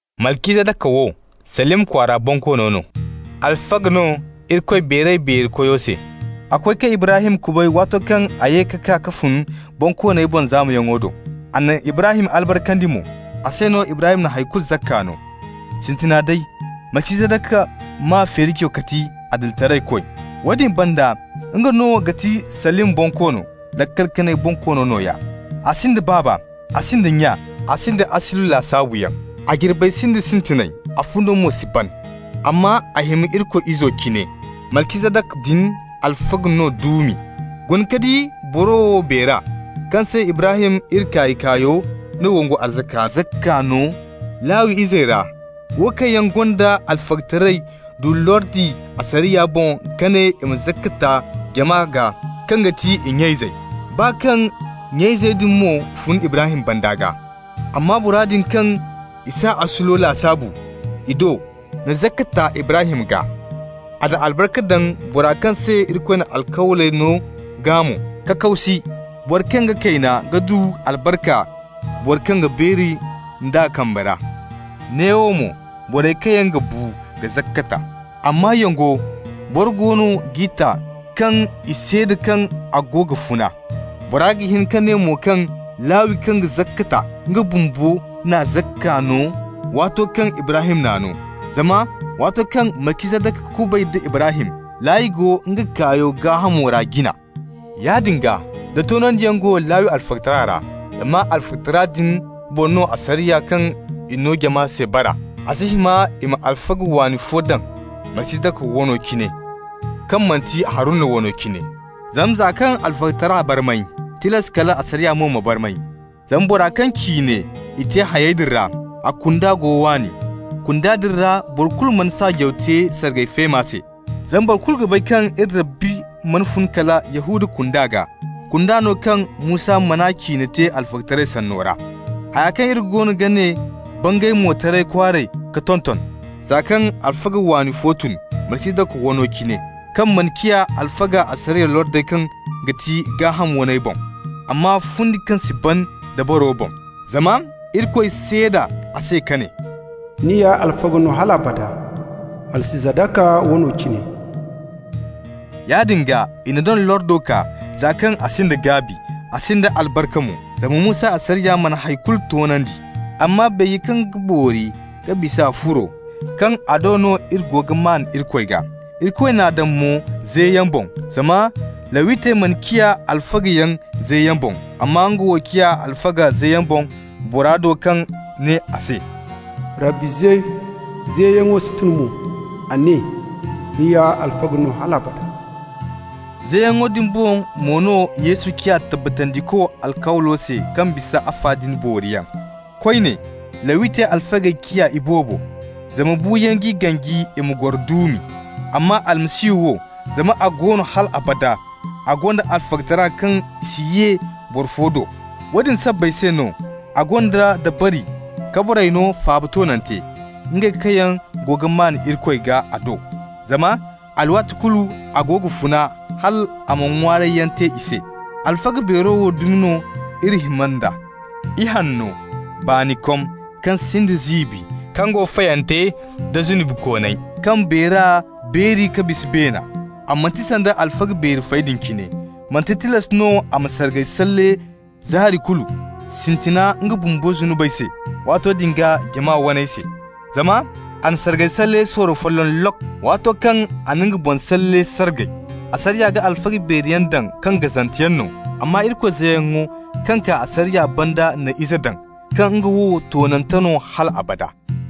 Malcizadaka wo, Salim kwaara bonkoono no, alfaga no Irikoy Beeray-Beeri-Koyo se. A koy ka Ibrahim kubay waato kaŋ a ye ka kaa ka fun bonkooney boŋ zaamayaŋo do. A na Ibrahim albarkandi mo. A se no Ibrahim na hay kulu zakka no. (Sintina day, Malcizadaka maa feerijo ga ti adilitaraykoy. Woodin banda nga no ga ti Salim bonkoono, laakal kanay bonkoono nooya. A sinda baaba, a sinda nya, a sinda asuli lasaabuyaŋ, a jirbey sinda sintinay, a fundo mo si ban. Amma a hima Irikoy Izo cine.) Malcizadaka din alfaga no duumi. Guna ka di boro wo beera, kaŋ se Ibrahim iri kaay-kaayo na wongu arzaka zakka no. Lawi izey ra, wo kaŋ yaŋ gonda alfagataray du lordi asariya boŋ kaŋ ne i ma zakka ta jama gaa kaŋ ga ti i nya-izey, baa kaŋ nya-izey din mo fun Ibrahim banda gaa. Amma bora din kaŋ i s'a asulo lasaabu i do na zakka ta Ibrahim gaa. A na albarka daŋ bora kaŋ se Irikoy na alkawley no gaa mo. Kakaw si, boro kaŋ ga kayna ga du albarka boro kaŋ ga beeri nd'a kambe ra. Neewo mo, borey kaŋ yaŋ ga bu ga zakka ta. Amma yongo, boro go no g'i ta kaŋ i seeda kaŋ a go ga funa. Boro ga hin ka ne mo kaŋ Lawi kaŋ ga zakka ta, nga bumbo na zakka no waato kaŋ Ibrahim n'a no, zama waato kaŋ Malcizadaka kubay da Ibrahim, Lawi go nga kaayo gaahamo ra jina. Yaadin gaa, da toonandiyaŋ go Lawi alfagatara ra (zama alfagatara din boŋ no asariya kaŋ i no jama se bara) a si hima i ma alfaga waani fo daŋ, Malcizadaka wano cine, kaŋ manti Haruna wano cine. Zama, za kaŋ alfagatara barmay, tilas kal asariya mo ma barmay. Zama bora kaŋ ciine i te hayey din ra, a kunda go waani. Kunda din ra boro kulu mana saajaw te sargay feema se. Zama boro kulu ga bay kaŋ iri Rabbi mana fun kala Yahuda kunda gaa, kunda no kaŋ Musa man'a ciine te alfagataray sanno ra. Haya kaŋ iri goono ga ne bangay mo taray kwaaray ka tonton, za kaŋ alfaga waani fo tun, Malcizadaka wano cine, kaŋ mana ciya alfaga asariya lordey kaŋ ga ti gaaham waney boŋ, amma fundi kaŋ si ban dabaro boŋ. Zama Irikoy seeda a se ka ne: «Ni ya alfaga no hal abada, Malcizadaka wano cine.» Yaadin gaa, i na doŋ lordo kaa, za kaŋ a sinda gaabi, a sinda albarka mo. Zama Musa asariya mana hay kulu toonandi. Amma beeje kaŋ ga boori ka bisa furo, kaŋ a do no iri go ga maan Irikoy gaa. Irikoy n'a daŋ mo zeyaŋ boŋ. Zama Lawitey mana ciya alfagayaŋ zeyaŋ boŋ, amma nga wo ciya alfaga zeyaŋ boŋ, bora do kaŋ ne a se: «Rabbi ze, zeyaŋo si tun mo. A ne: ‹Ni ya alfaga no hal abada.›» Zeyaŋo din boŋ mo no Yesu ciya tabbatandiko alkawlo se kaŋ bisa afa din booriyaŋ. Koyne Lawitey alfagey ciya iboobo, zama buuyaŋ g'i ganji i ma goro duumi. Amma Almasihu wo, zama a go no hal abada, a gonda alfagataray kaŋ i si ye boro fo do. Woodin sabbay se no a gonda dabari ka borey no faaba toonante, ngey kaŋ yaŋ go ga maan Irikoy gaa a do, zama alwaati kulu a go ga funa hal a ma ŋwaarayyaŋ te i se. Alfaga beero wo dumi no iri hima nd'a: ihanno, baanikom, kaŋ sinda ziibi, kaŋ go fayante da zunubikooney, kaŋ beera beeri ka bisa beena. A manti sanda alfaga beeri fey din cine. Manti tilas no a ma sargayyaŋ salle zaari kulu, sintina nga bumbo zunubey se, waato din gaa jama waney se. Zama a na sargay salle sorro folloŋ lok! waato kaŋ a na nga boŋ salle sargay. Asariya ga alfaga beeri yaŋ daŋ kaŋ gazanteyaŋ no. Amma Irikoy zeyaŋo kaŋ kaa asariya banda na Ize daŋ, kaŋ nga wo toonante no hal abada.